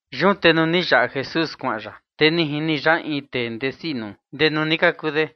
Yun te nuu ni yaꞌa Jesús kuaꞌan ya, te ni jini ya in tee ndesi nduchi nuu de ndee nuu ni kaku de.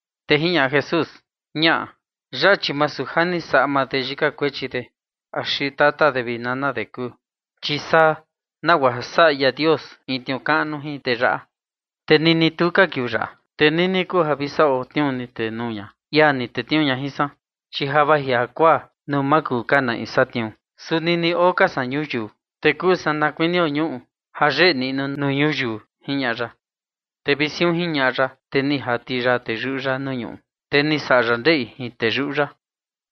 Te jiñaꞌa Jesús: ―Ñaꞌa. Yaꞌa chi masu ja ni saꞌa maa de yika kuechi axi tata de vi nana de kuu, chi saa nagua ja saꞌa ia Dios in tniuu kaꞌnu jin tee yaꞌa. Te nini tuu ka kiuu yaꞌa, te nini kuu ja vi saꞌo tniuu ni tenuu ña ia ni tetniuu ña jin san, chi ja vaji jakuaa nuu ma kuu ka na in satniuu. Su nini oo ka san ñuyiu, te kuu san na kuinio ñuꞌu ja yeꞌe niꞌnu nuu ñuyiu ―jiñaꞌa ya. Te vi siun jiñaꞌa ya, te ni jati ya teyuꞌu ya nuu ñuꞌu, te ni saꞌa ya ndeꞌi jin teyuꞌu ya,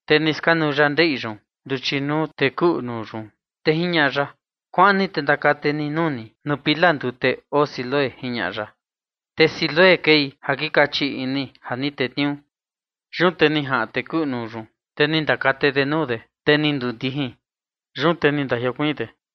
te ni skanuu ya ndeꞌi yun nduchi nuu tee kuꞌu nuu yun. Te jiñaꞌa ya: ―Kuaꞌan ni te ndakate ni nuu ni nuu pila ndute oo Siloé ―jiñaꞌa ya. (Te Siloé kei kaꞌan ja ni tetniuu.) Yun te ni jaꞌan tee kuꞌu nuu yun, te ni ndakate de nuu de, te ni ndundijin. Yun te ni ndajiokuiin de.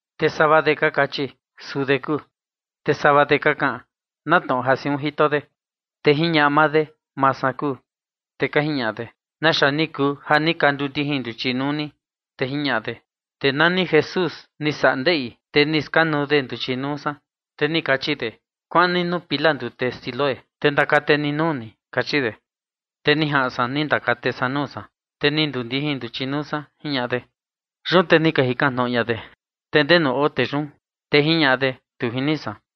Te sava de ka kachi: ―Suu de kuu. Te sava de ka kaꞌan: ―Na tnoꞌo ja siun jito de. Te jiñaꞌa maa de: ―Maa san kuu. Te ka jiñaꞌa de: ―¿Naxa ni kuu ja ni ka ndundijin nduchi nuu ni? Te jiñaꞌa de: ―Tee nani Jesús ni saꞌa de ndeꞌi, te ni skanuu de nduchi nuu san, te ni kachi de: “Kuaꞌan ni nuu pila ndute Siloé, te ndakate ni nuu ni”, kachi de. Te ni jaꞌan san ni ndakate san nuu san, te ni ndundijin nduchi nuu san ―jiñaꞌa de. Yun te ni ka jikan tnoꞌo ña de: ―¿Te ndenu oo tee yun? Te jiñaꞌa de: ―Tu jini san.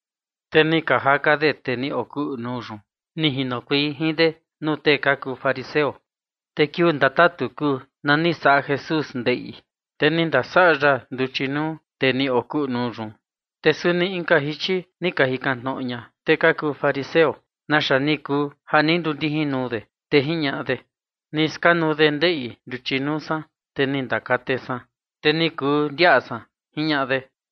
Te ni ka jaka de tee ni okuꞌu nuu yun, ni jinokuei jin de nuu tee ka kuu fariseo. Te kiuu ndatatu kuu na ni saꞌa Jesús ndeꞌi, te ni ndasaꞌa ya nduchi nuu tee ni okuꞌu nuu yun. Te suni inka jichi ni ka jikan tnoꞌo ña tee ka kuu fariseo naxa ni kuu ja ni ndundijin nuu de. Te jiñaꞌa de: ―Ni skanuu de ndeꞌi nduchi nuu san, te ni ndakate san, te ni kuu ndiaꞌa san ―jiñaꞌa de.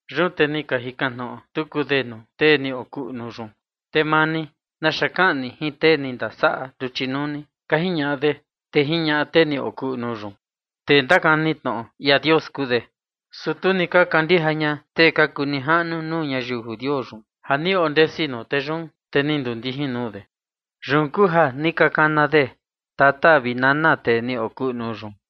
Yun te ni ka jikan tnoꞌo tuku de nuu tee ni okuꞌu nuu yun: ―Te maa ni, ¿naxa kaꞌan ni jin tee ni ndasaꞌa nduchi nuu ni? ―ka jiñaꞌa de. Te jiñaꞌa tee ni okuꞌu nuu yun: ―Tee ndakani tnoꞌo ia Dios kuu de. Su tu ni ka kandija ña tee ka kuu nijaꞌnu nuu ñayiu judio yun ja ni ondesi nuu tee yun, te ni ndundijin nuu de. Yun kuu ja ni ka kana de tata vi nana tee ni okuꞌu nuu yun.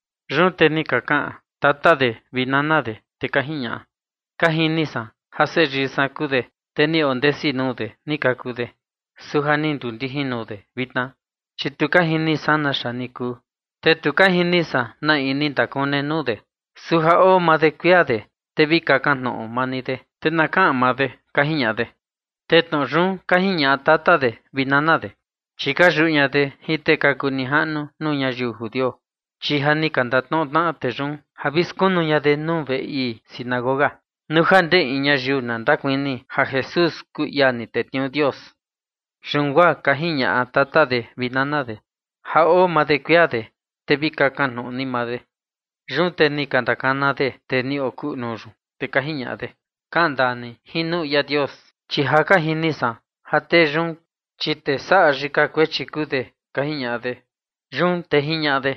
Yun te ni ka kaꞌan tata de vi nana de, te ka jiñaꞌa: ―Ka jini san ja seyii san kuu de, te ni ondesi nuu de ni kaku de. Su ja ni ndundijin nuu de vitna, chi tu ka jini san naxa ni kuu, te ni tu ka jini san na in ni ndakune nduchi nuu de. Su ja oo maa de kuia de, te vi kakan tnoꞌo maa ni de, te na kaꞌan maa de ―ka jiñaꞌa de. Te tnoꞌo yun ka jiñaꞌa tata de vi nana de, chi ka yuꞌu ña de jin tee ka kuu nijaꞌnu nuu ñayiu judio, chi ja ni ka ndatnoꞌo tnaꞌa tee yun ja vi skunu ña de nuu veꞌe ii sinagoga nuu ja ndee in ñayiu na ndakuni ja Jesús kuu ia ni tetniuu Dios. Yun guaa ka jiñaꞌa tata de vi nana de: “Ja oo maa de kuia de, te vi kakan tnoꞌo ni maa de”. Yun te ni ka ndakana de tee ni okuꞌu nuu yun, te ka jiñaꞌa de: ―Kaꞌan ndaa ni jin nuu ia Dios, chi ja ka jini san ja tee yun, chi tee saꞌa yika kuechi kuu de ―ka jiñaꞌa de. Yun te jiñaꞌa de: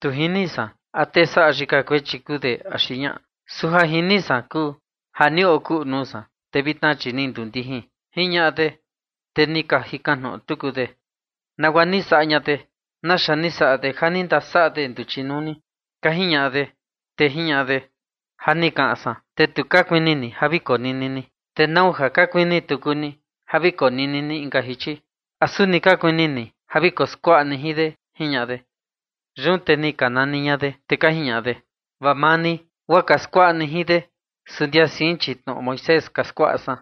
―Tu jini san a tee saꞌa yika kuechi kuu de axi ñaꞌa, su ja jini san kuu ja ni okuꞌu nuu san, te vitna, chi ni ndundijin ―jiñaꞌa de. Te ni ka jikan tnoꞌo tuku de: ―¿Nagua ni saꞌa ña de? ¿Naxa ni saꞌa de ja ni ndasaꞌa de nduchi nuu ni? ―ka jiñaꞌa de. Te jiñaꞌa de: ―Ja ni kaꞌan san, te tu ka kuini ni ja vi konini ni, ¿te nau ja ka kuini tuku ni ja vi konini ni inka jichi? ¿A suni ka kuini ni ja vi koskuaꞌa ni jin de? ―jiñaꞌa de. Yun te ni ka nani ña de, te ka jiñaꞌa de: ―Vaa maa ni guaa ka skuaꞌa ni jin de, su ndia sein, chi tnoꞌo Moisés ka skuaꞌa san.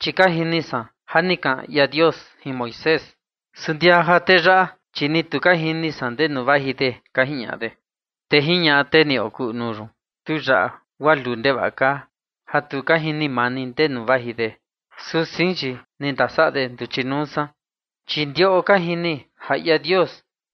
Chi ka jini san ja ni kaꞌan ia Dios jin Moisés, su ndia ja tee yaꞌa, chi ni ja tu ka jini san ndenu vaji de ―ka jiñaꞌa de. Te jiñaꞌa tee ni okuꞌu nuu yun: ―Tu yaꞌa guaa luu ndevaꞌa kaa, ja tu ka jini maa ni ndenu vaji de, su sein, chi ni ndasaꞌa de nduchi nuu san. Chi ndiꞌo ka jini ja ia Dios,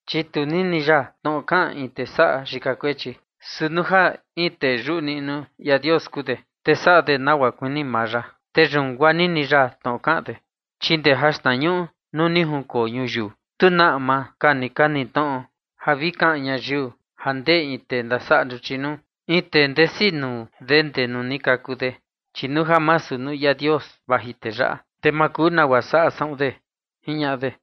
chi tu nini ya tnoꞌo kaꞌan in tee saꞌa yika kuechi, su nuu ja in tee yuꞌu niꞌnu ia Dios kuu de, te saꞌa de nagua kuini maa ya, te yun guaa nini ya tnoꞌo kaꞌan de. Chi ndee jaxtnañuꞌu nuu ni junkoo ñuyiu, tu na ama ka ni ka niꞌi tnoꞌo ja vi kaꞌan ñayiu ja ndee in tee ndasaꞌa nduchi nuu, in tee ndesi nuu de ndee nuu ni kaku de. Chi nuu ja masu nuu ia Dios vaji tee yaꞌa, te ma kuu nagua saꞌa saꞌun de ―jiñaꞌa de.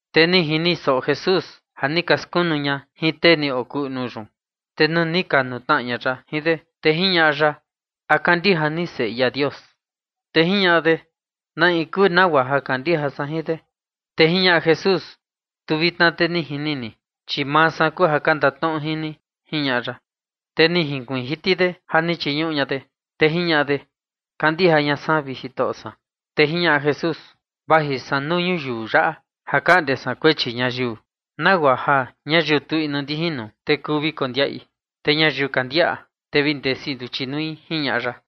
Te ni jini soꞌo Jesús ja ni ka skunu ña jin tee ni okuꞌu nuu yun. Te nuu ni ka nukuntnaꞌa ya jin de, te jiñaꞌa ya: ―¿A kandija ni Seꞌe ia Dios? Te jiñaꞌa de: ―¿Na in kuu, nagua ja kandija san jin de? Te jiñaꞌa Jesús: ―Tu vitna te ni jini ni, chi maa san kuu ja ka ndatnoꞌo jin ni ―jiñaꞌa ya. Te ni junkuiin jiti de ja ni chiñuꞌu ña de, te jiñaꞌa de: ―Kandija ña san, vi Jitoꞌo san. Te jiñaꞌa Jesús: ―Vaji san nuu ñuyiu yaꞌa ja kaꞌnde san kuechi ñayiu, nagua ja ñayiu tu inu ndijin nuu, te kuu vi kondiaꞌi, te ñayiu ka ndiaꞌa, te vi ndesi nduchi nui ―jiñaꞌa ya.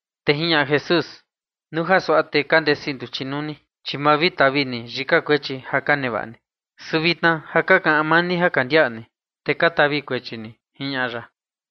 Te jiñaꞌa Jesús: ―Nuu ja suaꞌa te ka ndesi nduchi nuu ni, chi ma vi tavi ni yika kuechi ja ka nevaꞌa ni. Su vitna ja ka kaꞌan maa ni ja ka ndiaꞌa ni, te ka tavi kuechi ni ―jiñaꞌa ya.